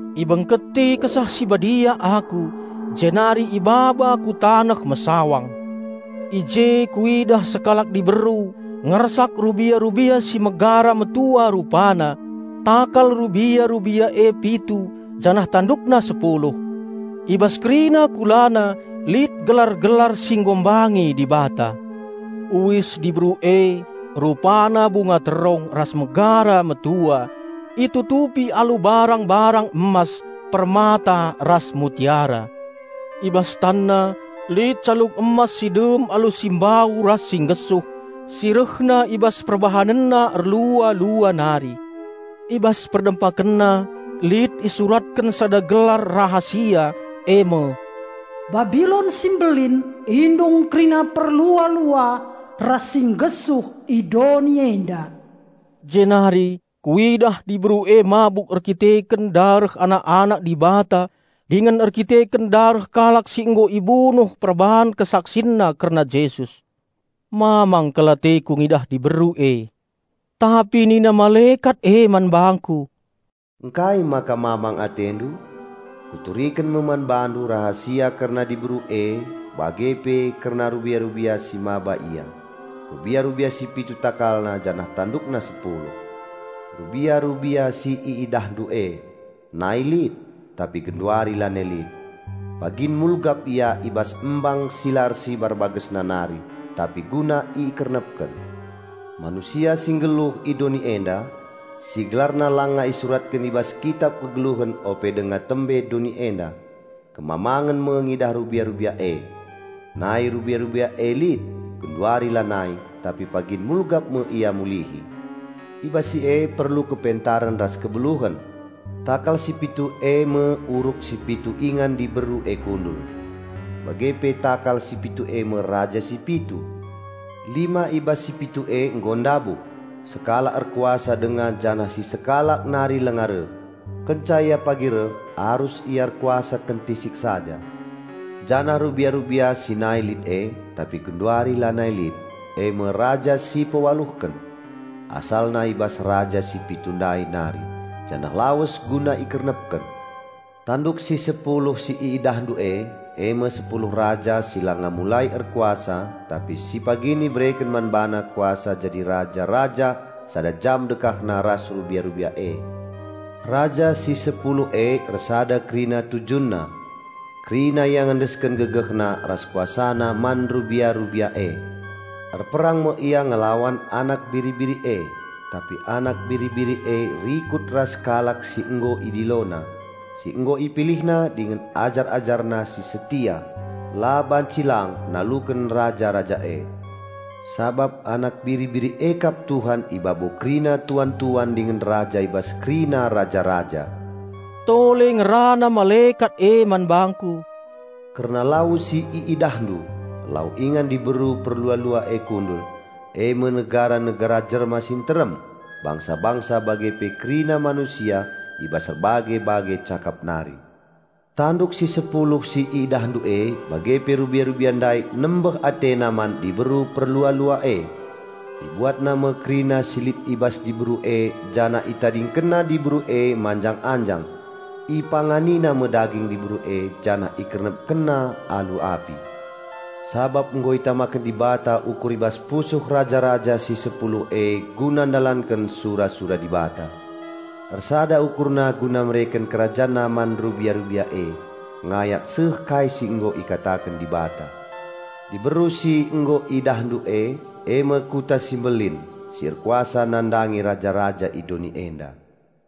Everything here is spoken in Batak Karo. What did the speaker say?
Ibengketi Kesah Si Badia aku jenari ibaba ku taneh mesawang. I je kuidah sekalak diberu ngersak rubia-rubia si megara metua rupana; takal rubia-rubia e pitu janah tandukna sepuluh. I bas kerina kulana lit gelar-gelar si enghina Dibata. Uis diberu e rupana bunga terong ras megara metua, itutupi alu barang-barang emas, permata ras mutiara. I bas tanna lit calung emas si dem alu si mbau ras si nggesuh, si rehna i bas perbahanenna erlua-lua nari. I bas perdempakenna lit isuratken sada gelar rahasia e me, "Babilon si mbelin, indung kerina perlua-lua ras si nggesuh i doni enda." Jenari kuidah diberu e mabuk erdandanken dareh anak-anak Dibata dingen erdandanken dareh kalak si nggo ibunuh perbahan kesaksinna kerna Jesus. Mamang kal ateku ngidah diberu e. Tapi nina malekat e man bangku, "Engkai maka mamang atendu? Kuturiken me man bandu rahasia kerna diberu e bage pe kerna rubia-rubia si mbaba ia, rubia-rubia si pitu takalna janah tandukna sepuluh. Rubia-rubia si iidahndu e, nai lit, tapi genduari lanai lit. Pagin mulgap ia i bas embang si la ersibar bagesna nari, jenari lawes guna ikernepken. Manusia si nggeluh i doni enda, si gelarna langa isuratken i bas Kitap kegeluhen ope denga tembe doni enda, kemamangen me ngidah rubia-rubia e. Nai rubia-rubia e lit, genduari lanai, tapi pagin mulgap me ia mulihi. I bas si e perlu kepentaren ras kebeluhen. Takal si pitu e me uruk si pitu ingan diberu e kundul. Bage pe takal si pitu e me raja si pitu: lima i bas si pitu e nggo ndabuh, sekalak erkuasa denga janah si sekalak nari langa reh. Kenca ia pagi reh, arus ia erkuasa kentisik saja. Janah rubia-rubia si nai lit e, tapi genduari lanai lit, e me raja si pewaluhken. Asalna i bas raja si pitu ndai nari, janah lawes guna ikernepken. Tanduk si sepuluh si iidahndu e, e me sepuluh raja si langa mulai erkuasa tapi si pagin ibereken man bana kuasa jadi raja-raja sada jam dekahna ras rubia-rubia e. Raja si sepuluh e ersada kerina tujunna. Kerina ia ngendesken gegehna ras kuasana man rubia-rubia e. Erperang me ia ngelawan Anak Biri-biri e, tapi Anak Biri-biri e rikut ras kalak si nggo IdiloNa, si nggo IpilihNa dingen ajar-AjarNa si setia, la banci lang naluken raja-raja e. Sabap Anak Biri-biri e kap Tuhan i babo kerina tuan-tuan dingen Raja i bas kerina raja-raja." Tole ngerana malekat e man bangku, "Kerna lau si iidahndu, lau ingan diberu perlua-lua e kundul, e me negara-negara jelma si nterem, bangsa-bangsa bage pe kerina manusia i bas erbage-bage cakap nari. Tanduk si sepuluh si iidahndu e bage pe rubia-rubia ndai nembeh atena man diberu perlua-lua e. Ibuatna me kerina si lit i bas diberu e janah itadingkenna diberu e manjang-anjang. Ipanganina me daging diberu e janah ikernepkenna alu api. Sabap nggo itamaken Dibata ukur i bas pusuh raja-raja si sepuluh e guna ndalanken sura-sura Dibata; ersada ukurna guna mereken kerajanna man rubia-rubia e ngayak seh kai si nggo ikataken Dibata. Diberu si nggo idahndu e, e me kuta si mbelin, si erkuasa nandangi raja-raja i doni enda."